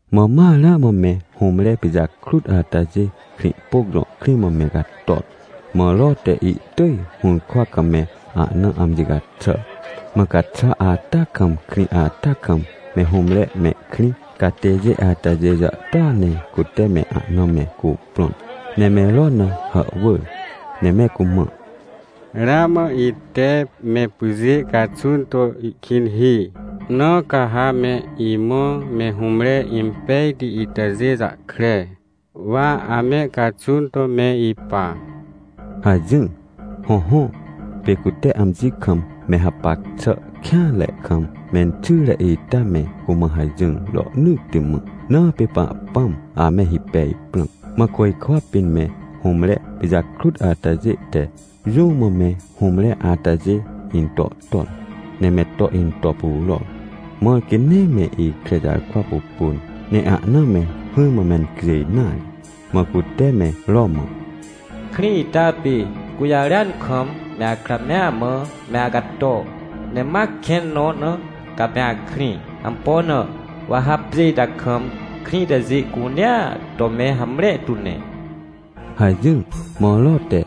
Mã ma ramã me hũmre pijakrut atajê Krĩhpôc jõ krĩ mã me cator. Mã Ro te ihtỳj hũrkwa kam me ahna amji caxàr. Mã caxwa ata kam krĩ ata kam me hũmre mehkrĩ catêjê atajê jàhtôa ne cute me ahna me cuprõn, ne me Ro na hàhwỳr, ne me cumã: — Ramã ite me pyjê caxun to ihkĩn hi, na ca ha me imã me hũmre impejti itajê jahkre, wa ame caxun to me ipa — hajỹr. Hõhõ, pê cute amji kam me hapac xà kêanre kam menxyre ita me cumã hajỹr rohnỳtti mã, na pê Pahpãm ame hipej prãm. Mã côjkwa pĩn me hũmre pijakrut atajê te jũ mã me hũmre atajê into ton, ne me to into puror, mãr quê nee me ikre jarkwa pupun, ne ahna me hỹrmã mencjêj nare. Mã cute me Ro mã: — Krĩ ita pê gũjarêan kam, me akra mea mã, me acato! Ne ma kẽn nõ na, ca me akrĩ. Ampo na? Wa ha pjê ita kam, krĩ itajê cunea to me hamre tu ne — hajỹr. Mã Ro te,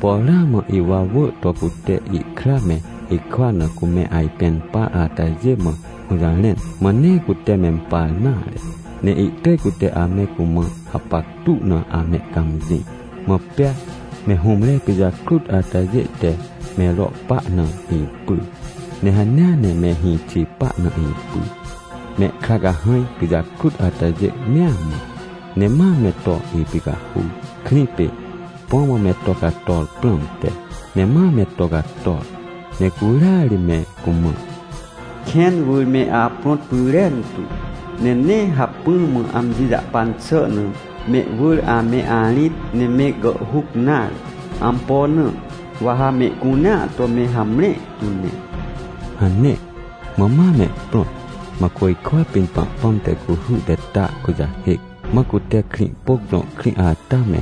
por ramã ihwawỳ to cute ihkra me hikwa na cume ajpẽn par atajê mã hũjarẽn, mã nee cute mempar nare, ne ihtỳj cute ame cumã hapactu na amehcãmjĩ. Mã pea me hũmre pijakrut atajê te me Ro pa na ipyr, ne hanea ne me hĩxi pa na ipyr, mehkra cahãj pijakrut atajê mea mã, ne ma me to ipicahur, krĩ pê, põ mã me to cator prãmte. Ne ma me to cator, ne curia ri me cumã: — Kẽn wỳr me aprõt pyrentu, ne nee hacpỹ mã amji jahpan xà na mehwỳr ame arĩt ne me gàhhuc nare. Ampo na? Wa ha mehcunea to me hamre tu ne — hane. Mã ma mehprõt, mã côjkwa pĩn Pahpãm te cuhy te ta kujahêc, mã cute Krĩhpôc jõ krĩ ata me,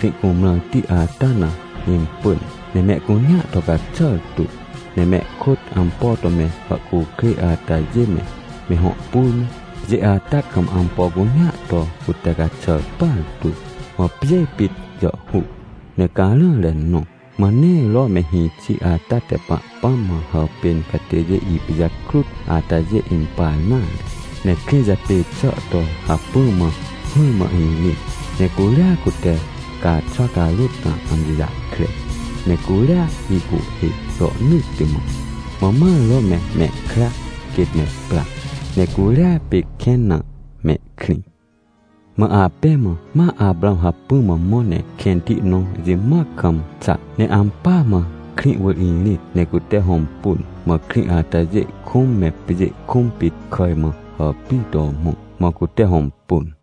Krĩhcumrãrti ata na impỳn, ne mehcunea to caxàr tu. Ne mehkôt ampo to me hàhcukrêj atajê me, me hõ pur me, pjê ata kam ampo cunea to cute caxàr partu, mã pjê pit jàhhuc, ne carãre nõ. Mã nee Ro me hĩxi ata te Pahpãm mã hàpên catêjê ipijakrut atajê impar nare, ne krĩ japê xà to hacpỹ mã hỹrmã irĩt, ne curia cute caaxwa carôt na amji jahkre, ne curia ihcuhhê rohnỳtti mã. Mã ma Ro me mehkra quêt me pra, ne curia pê kẽn na mehkrĩ. Mã apẽ mã ma Aprãw hacpỹ mã mõ ne kẽnti nõ jimoac kam xa, ne ampỳa mã krĩ wỳr irĩt ne cute hõmpun. Mã krĩ atajê kũm, me pjê kũm pit kàj mã hàpir to mõ, mã cute hõmpun.